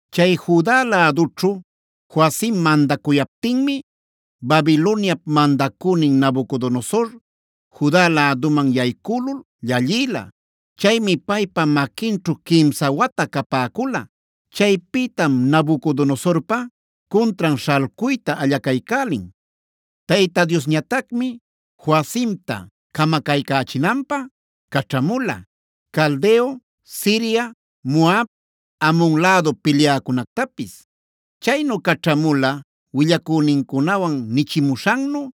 Chay Juda lädućhu Joacim mandacuyaptinmi, Babiloniap mandacünin Nabucodonosor Juda läduman yaycülul llallïla.a Chaymi paypa maquinćhu quimsa wata capäcula. Chaypïtam Nabucodonosorpa cuntran śhalcuyta allacaycälin. Tayta Diosñatacmi Joacimta camacaycächinanpä caćhamula: Caldeo, Siria, Moab, Amon lädu pilyäcunactapis. Chaynu caćhamula willacünincunawan nichimuśhannu,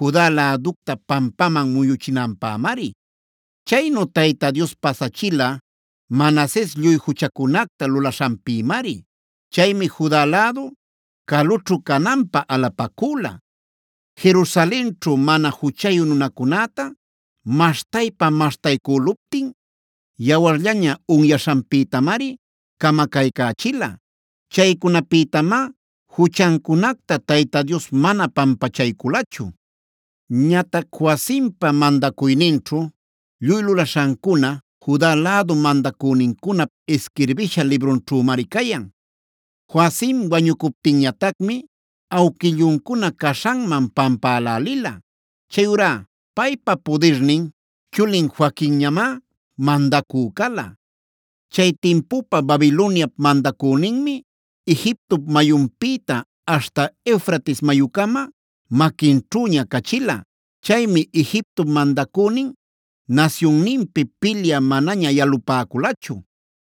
Juda läducta pampaman muyuchinanpämari. Chaynu Tayta Dios pasachila Manases lluy juchacunacta lulaśhanpïmari. Chaymi Juda lädu calućhu cananpä alapacüla. Jerusalenćhu mana juchayu nunacunäta maśhtaypa-maśhtaycüluptin, yawarllaña unyaśhanpïtamari camacaycächila. Chaycunapïtamá juchancunacta Tayta Dios mana pampachayculachu. Ñatac Joacimpa mandacuyninćhu lluy lulaśhancuna, Juda lädu mandacünincunap isquirbisha librunćhümari cayan. Joacim wañucuptinñatacmi awquilluncuna caśhanman pampälälila. Chayurá paypa pudirnin chulin Joaquinñamá mandacü cala. Chay timpupa Babiloniap mandacüninmi, Egiptop mayunpïta aśhta Eufrates mayucama maquinćhüña cachila. Chaymi Egiptop mandacünin nasyunninpi pilyä manaña yalupäculachu.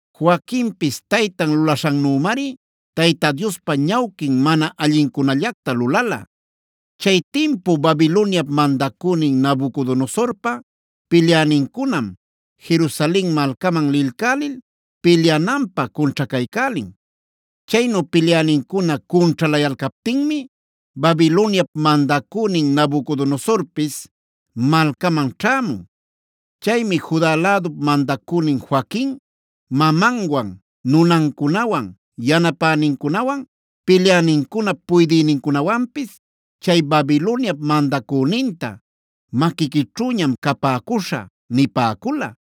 Joaquinpis taytan lulaśhannümari Tayta Diospa ñawquin mana allincunallacta lulala. Chay timpu Babiloniap mandacünin Nabucodonosorpa pilyänincunam, Jerusalen malcaman lilcälil pilyananpä cunćhacaycälin. Chaynu pilyänincuna cunćhalayalcaptinmi, Babiloniap mandacünin Nabucodonosorpis malcaman ćhämun. Chaymi Juda lädup mandacünin Joaquin, mamanwan, nunancunawan, yanapänincunawan, pilyänincunap puydïnincunawanpis chay Babiloniap mandacüninta: “Maquiquićhüñam capäcuśha” nipäcula.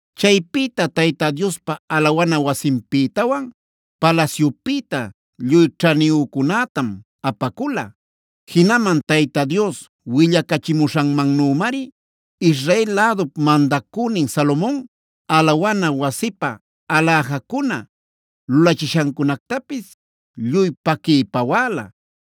Chaypïta Tayta Diospa alawana wasinpïtawan palasyupïta lluy ćhaniyücunätam apacula. Jinaman Tayta Dios willacachimuśhanmannümari, Israel lädup mandacünin Salomon alawana wasipä aläjacuna lulachishancunactapis lluy paquiy pawäla.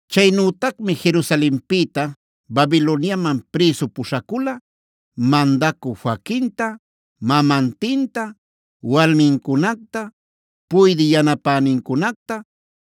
Chaynütacmi Jerusalenpïta Babiloniaman prïsu puśhacula: mandacü Joaquinta, mamantinta, walmincunacta, puydï yanapänincunacta,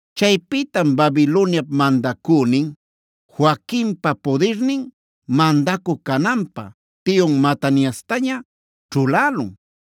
Chaypïtam Babiloniap mandacünin, Joaquinpa pudirnin mandacü cananpä tiyun Mataniastaña ćhulälun.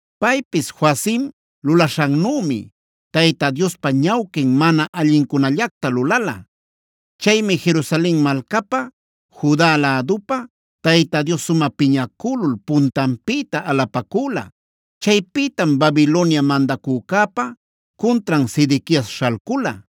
Paypis Joacim lulaśhannümi, Tayta Diospa ñawquin mana allincunallacta lulala. Chaymi Jerusalen malcapä, Juda lädupä Tayta Dios sumä piñacülul puntanpïta alapacüla.g Chaypïtam Babilonia mandacücäpa cuntran Sedequias śhalcula.